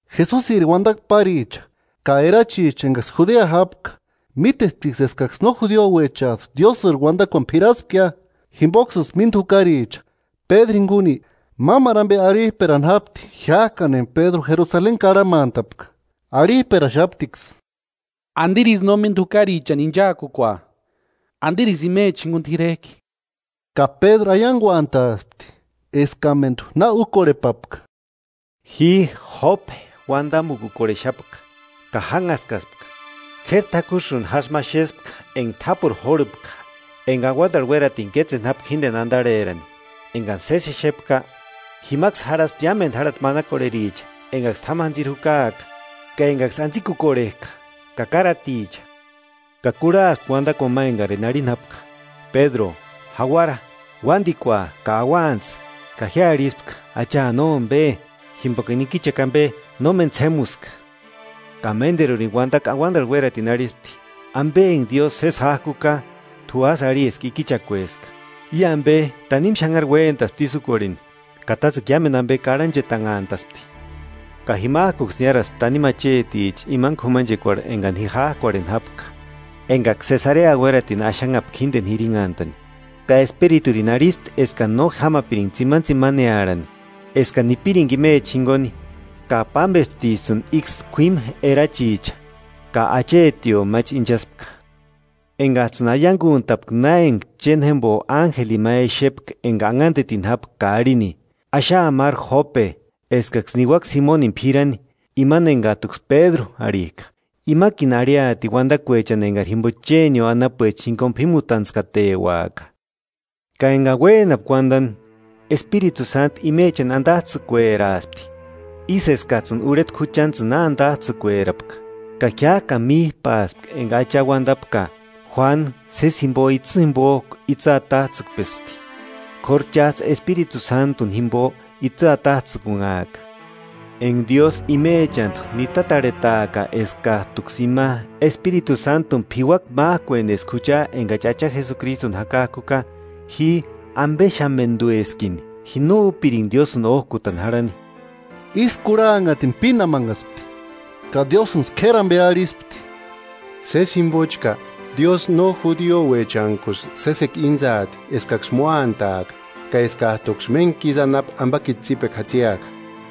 Jesusiri uandakua páricha ka erachicha engaksï Judea jápka, mítesptiksï eskaksï no judiuechajtu Diósïri uandakuani p'iraspkia. Jimboksïsï mínda jukaricha Pédru jinguni, mámaru ambe arhirperani jápti jiájkani enga Pédru Jerusaleni karhamantapka, arhijperaxaptiksï: –¿Andirisï no mínda jukarichani inchaakukua? ¿Andirisï imecha jinguni t'irejki? Ka Pédru aianguantaaspti eskamendu na úkorhepapka: 5–Ji Jópe uandamukukorhexapka, ka jánhaskaspka: K'éri takusïni jásï ma exespka enga t'ápuru jórhupka enga auandarhu uératini kétseni jápka jíndeni andarherani. Engani sési exeka, jimaksï jarhaspti iámendu járhati manakorhericha, engaksï t'ámu jantsiri jukaaka ka engaksï antsikukorhejka ka káraticha. Ka kurhaaspka uandakuani ma engarini arhini jápka: Pédru jauara, uandikua ka auantsï. Ka ji arhispka: Acha, nómbe, jimbokani ikichakua ambe nóna méni ts'émuska. Ka ménderurini uandakua auandarhu uératini arhispti: Ambe enga Diósï sési jájkuka, t'u ásï arhi eska ikichakueska. I ambe tanimu xanhari uéntaspti ísï úkorheni, ka tátsekua iámendu ambe karhanchetanhantaspti. Ka jimajkuksï niáraspti tanimu acheticha imani k'umanchekuarhu engani ji jájkuarheni jápka, engaksï Sesarea uératini axanhapka jíndeni jirinhantani. Ka Espiriturini arhispti eskani no jámapiringa tsimanitsimanearhani, eskani nipiringa imechani jinguni. Ka pámbesptijtsïni íksï kuímu erachicha, ka achetio máchi inchaspka, engajtsïni aianguntapka na enga chéni jémbo ánjelini ma exepka enga anhandetini jápka ka arhini: Axaa máru Jópe, eskaksï niuaka Simonini p'irani, imani engajtuksï Pédru arhijka; imakini arhiaati uandakuechani engari jimbo chénio anapuecha jinguni p'ímutantskateuaka. Ka engani uénapka uandani, Espiritu Sántu imechani andajtsïkueraaspti, ísï eskajtsïni urhetku juchantsïni na andajtsïkuerapka. Ka jiájkani míjpaspka enga Acha uandapka: Juánu sési jimbo itsï jimbojku itsï atajtsïkpesti, k'óru chájtsï Espiritu Sántuni jimbo itsï atajtsïkunhaaka. Enga Diósï imechantu nitarhetaaka eskajtuksï ima Espiritu Sántuni p'iuaka májkueni eska jucha engachi Acha Jesukristuni jakajkuka, ji ambexamendueskini, ji no úpiringa Diósïni ójkutani jarhani. Ísï kurhanhatini pínamanhaspti ka Diósïnksï k'éri ambe arhispti: –¡Sési jimbochka Diósï no judiuechankusï sésekua íntsaasti eskaksï móataaka, ka eskajtuksï méntkisï anapu ambakiti tsípekua jatsiaka!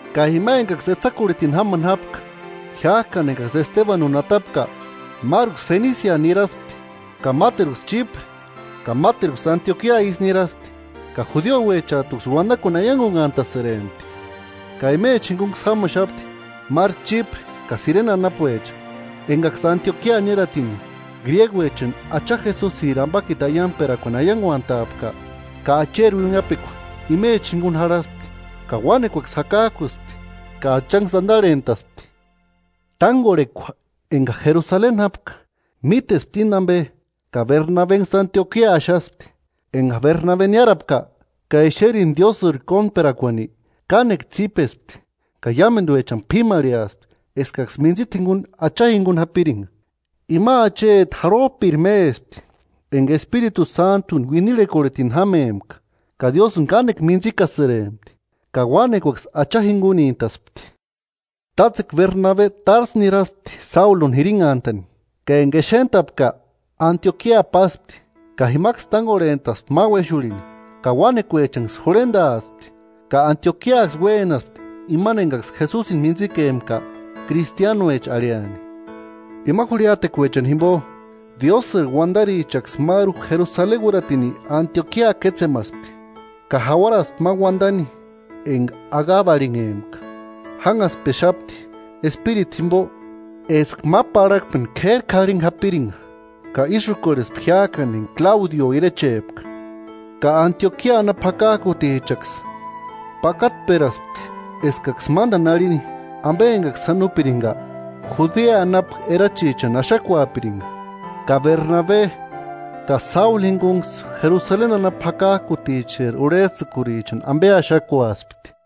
Ka ima engaksï etsakurhitini jámani jápka jiájkani engaksï Estebanuni atapka, máruksï Fenisia niraspti ka máteruksï Chípre ka máteruksï Antiokia isï niraspti, ka judiuechantkuksï uandakuani aianguantasïrempti. Ka imechani jingunksï jámaxapti máru Chípre ka Sirene anapuecha, engaksï Antiokia niáratini gríeguechani Acha Jesusiri ambakiti aiangperakuani aianguantaapka. Ka Acheri uinhapekua imecha jinguni jarhaspti, ka uánekuaksï jakajkuspti ka Achanksï andarhentaspti. Tángorhekua enga Jerusaleni jápka mítespti íni ambe ka Bernabenksï Antiokia axaspti. Enga Bernabe niárapka, ka exerini Diósïri kóntperakuani, kánekua tsípespti ka iámenduechani p'ímarheaspti eskaksï mintsita jinguni Acha jinguni japiringa. Ima acheti jarhojpiri mésti enga Espiritu Sántuni uinirhekorhetini jámempka ka Diósïni kánekua mintsikasïrempti. Ka uánekuaksï Acha jingunintaspti. Tátsekua Berbabe Társu niraspti Sáuluni jirinhantani ka enga exentapka Antiokia páspti. Ka jimaksï tángorhentaspti ma uéxurhini, ka uánekuechanksï jurhendaaspti. Ka Antiokiaksï uénaspti imani engaksï Jesusini mintsikempka: “Kristianuecha” arhiani. Ima jurhiatekuechani jimbo, Diósïri uandarichaksï máru Jerusaleni uératini Antiokia kétsemaspti. Ka jauaraspti ma uandani enga Agabo arhinhempka, jánhastpexapti Espiritu jimbo eska ma parhakpeni k'éri k'arhingua japiringa; ka ísï úkorhespti jiájkani enga Kláudio irechepka. Ka Antiokia anapu jakajkutichaksï, pakatperaspti eskaksï mándani arhini ambe engaksï sáni úpiringa, Judea anapu erachichani axakuapiringa; ka Bernabe ka Sáulu jiniguksï Jerusaleni anapu jakajkuticheri urhejtsïkurichani ambe axakuaspti.